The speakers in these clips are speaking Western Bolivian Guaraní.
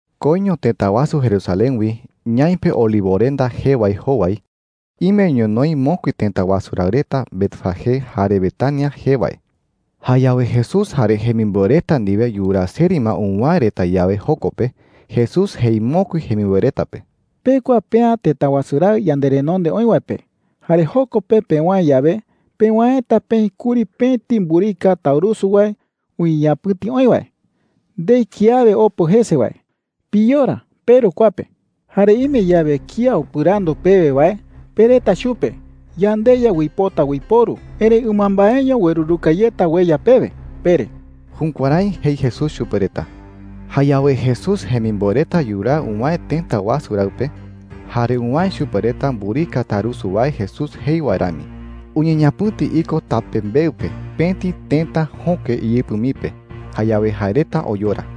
Koiño tëta wasu Jerusalén wi, ñaipe Olivorenda jee wae jowai, ime ñonoï mokui tëta wasu raɨ reta Betfagé jare Betania jee wae. Jayawe Jesús jare jemimboe reta ndiwe yuraa seri ma uwäe reta yawe joko pe, Jesús jei mokui jemimboe reta pe: “Pekua pea tëta wasu raɨ yanderenonde oï wae pe. Jare joko pe pewäe yawe, pewäeta peï kuri pëti mburika taurusu wae uñeñapɨ̈ti oï wae, ndei kiawe opo jese wae. Piyora peru kua pe,” jei chupe reta. “Jare ime yawe kía upɨrandu pewe wae, pereta chupe: ‘YandeYa uipota uiporu, erëi ɨmambaeño ueruruka yeta ueya pewe,’ pere.” Jukuärái jei Jesús chupe reta. Jayawe Jesús jemimboe reta yuraa uwäe tëta wasu raɨ pe, jare uwäe chupe reta mburika taurusu wae Jesús jei wae rami. Uñeñapɨ̈ti iko tapembeɨ pe pëti tëta jöke iyɨpɨ mii pe. Jayawe jae reta oyora.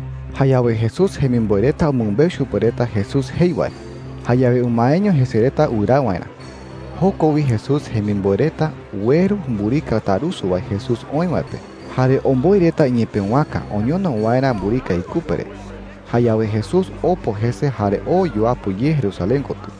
Jayawe Jesús jemimboe reta umɨmbeu chupe reta Jesús jei wae. Jayawe umaeño jese reta wɨraa waerä. Joko wi Jesús jemimboe reta ueru mburika taurusu wae Jesús oï wae pe jare omboi reta iñepëwaka oñono waerä mburika ikupe re. Jayawe Jesús opo jese jare oo yuapɨ ye Jerusalén kotɨ.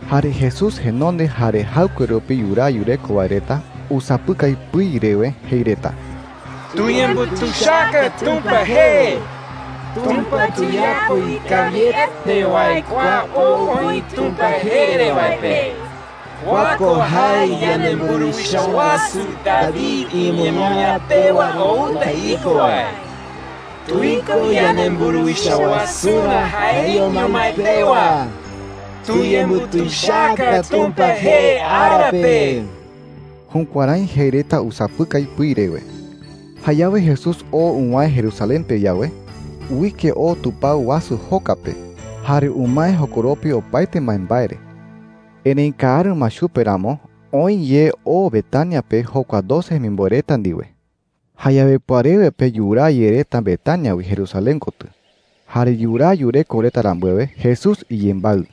Jare Jesús jenonde jare jaɨkue rupi yuraa yureko wae reta usapɨkai pɨi rewe jei reta: “¡Tuyembutuichaka Tumpa jee! ¡Tumpa tuyapo ikawiete wae kua ou oï Tumpa jee re wae pe! Kua ko jae yanemburuwicha wasu David iñemoñaa pewa outa iko wae. ¡Tuiko yanemburuwicha wasurä jaeño mái pewa! ¡Tuyembutuichaka Tumpa jee ara pe!” Jukuärái jei reta usapɨkai pɨi rewe. Jayawe Jesús oo uwäe Jerusalén pe yawe, uike oo tupao wasu joka pe jare umae jokoropi opaete mbaembae re. Erëi kaaru ma chupe ramo, oë ye oo Betania pe jokua doce jemimboe reta ndiwe. Jayawe pɨarewe pe yuraa ye reta Betania wi Jerusalén kotɨ. Jare yuraa yureko reta rambuewe, Jesús iyembaɨ.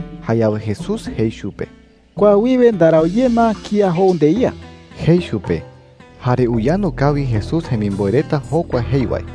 Jayawe Jesús jei chupe: “Kua wiwe ndarau ye ma kía jou ndeía,” jei chupe. Jare uyandu kawi Jesús jemimboe reta jokua jei wae.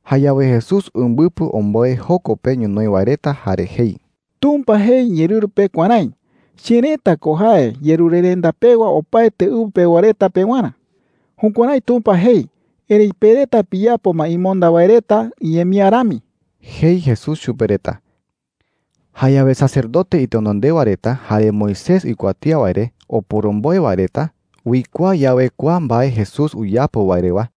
Jayawe Jesús umbɨpɨ omboe joko pe ñonoï wae reta jare jei: “Tumpa jei iñeerɨru pe kuärái: ‘Cherëta ko jae yerurerenda pewa opaete ɨwɨ pewa reta pewarä.’ Jukuärái Tumpa jei. Erëi pe reta piyapo ma imonda wae reta iñemía rami,” jei Jesús chupe reta. Jayawe sacerdote itenondewa reta jare Moisés uikuatía wae re oporomboe wae reta uikuaa yawe kua mbae Jesús uyapo wae rewa,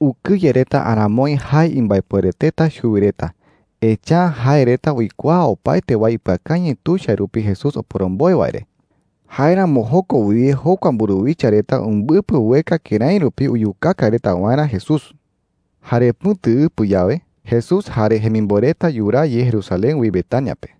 ukɨye reta aramoi jae imbaepuereteta chuwi reta. Echa’ä jae reta uikuaa opaete wae ipɨakañɨ tuicha rupi Jesús oporomboe wae re. Jáeramo joko wiwe jokua mburuwicha reta umbɨpɨ ueka kërái rupi uyukaka reta waerä Jesús. Jare pɨ̈tuɨpɨ yawe, Jesús jare jemimboe reta yuraa ye Jerusalén wi Betania pe.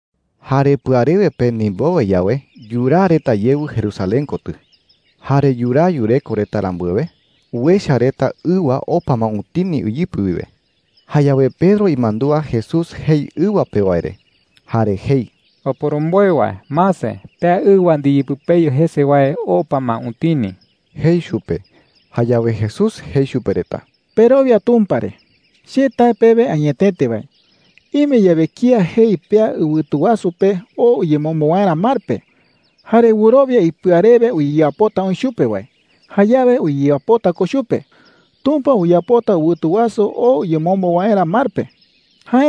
Jare pɨarewe pe ndimbowe yawe, yuraa reta yewɨ Jerusalén kotɨ. Jare yuraa yureko reta rambuewe, uecha reta ɨwa opa ma utini iyɨpɨ wiwe. Jayawe Pedro imandúa Jesús jei ɨwa pe wae re, jare jei: “¡Oporomboe wae, mase! Pea ɨwa ndiyepɨpeyu jese wae opa ma utini,” jei chupe. Jayawe Jesús jei chupe reta: “Perowia Tumpa re,” jei. “Che tae pewe añetete wae, ime yawe kía jei pea ɨwɨtu wasu pe oo uyemombo waerä mar pe, jare wɨrowia ipɨa rewe uyeyapota oï chupe wae, jayawe uyeyapota ko chupe. Tumpa uyapota ɨwɨtu wasu oo uyemombo waerä mar pe,” jei chupe reta.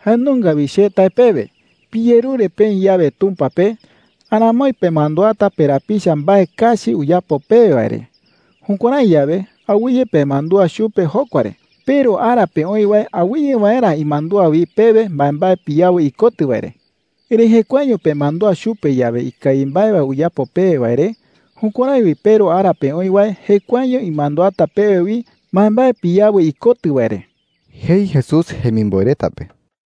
“Jae nunga wi che tae pewe, piyerure peï yawe Tumpa pe, aramoi pemanduata perapicha mbae kachi uyapo pewe wae re. Jukuärái yawe, awɨye pemandúa chupe jokua re, peRu ara pe oï wae awɨye waerä imandúa wi pewe mbaembae piyawɨ ikotɨ wae re,” jei. “Erëi jekuaeño pemandúa chupe yawe ikawi mbae wae uyapo pewe wae re, jukuärái wi peRu ara pe oï wae jekuaeño imanduata pewe wi mbaembae piyawɨ ikotɨ wae re,” jei Jesús jemimboe reta pe.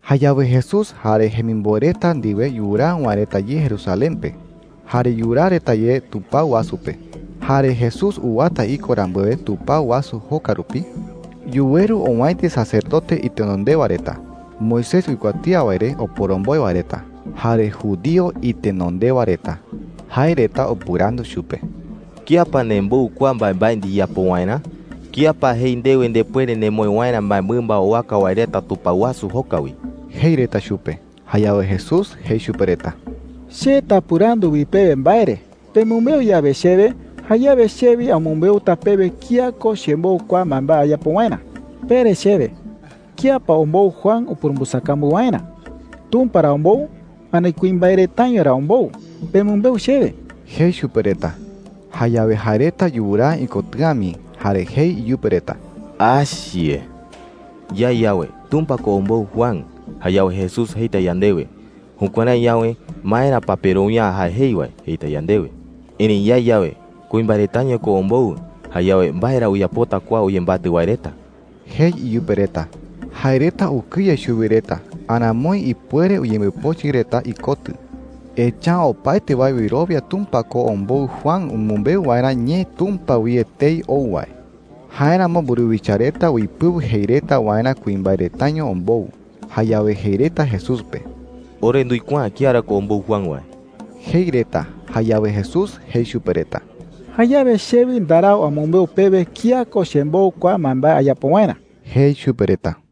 Jayawe Jesús jare jemimboe reta ndiwe yuraa uwäe reta ye Jerusalén pe jare yuraa reta ye tupao wasu pe. Jare Jesús uwata iko rambuewe tupao wasu joka rupi, yuweru owäiti sacerdote itenondewa reta, Moisés uikuatía wae re oporomboe wae reta, jare judío itenondewa reta. Jae reta upɨrandu chupe: “¿Kía pa nembou kua mbaembae ndiyapo waerä? ¿Kía pa jei ndewe ndepuere nemoë waerä mbaemɨmba owaka wae reta tupao wasu joka wi?” jei reta chupe. Jayawe Jesús jei chupe reta: “Che tapɨrandu wi pewe mbae re,” jei chupe reta. “Pemɨmbeu yawe chewe, jayawe che wi amɨmbeuta pewe kía ko chembou kua mbaembae ayapo waerä,” jei. “Pere chewe, ¿kía pa ombou Juan upurumbɨsakambu waerä? ¿Tumpa ra ombou, ani kuimbae retaño ra ombou? Pemɨmbeu chewe,” jei chupe reta. Jayawe jae reta yuraa ikotɨ̈a mii jare jei iyupe reta: “Yae yawe, ‘Tumpa ko ombou Juan,’ jayawe Jesús jeita yandewe, ‘Jukuärái yawe, ¿maera pa perowia’ä jae jei wae?’ jeita yandewe. Erëi yae yawe, ‘Kuimbae retaño ko ombou,’ jayawe ¿mbae ra uyapota kua uyembatɨ wae reta?” jei iyupe reta. Jae reta ukɨye chuwi reta aramoi ipuere uyembopochɨ reta ikotɨ. Echa’ä opaete wae wɨrowia Tumpa ko ombou Juan umɨmbeu waerä ñee Tumpa wi etei ou wae. Jáeramo mburuwicha reta uipɨu jei reta waerä kuimbae retaño ombou. Jayawe jei reta Jesús pe: “Ore nduikuaa’ä kía ra ko ombou Juan wae,” jei reta. Jayawe Jesús jei chupe reta: “Jayawe che wi ndarau amɨmbeu pewe kía ko chembou kua mbaembae ayapo waerä,” jei chupe reta.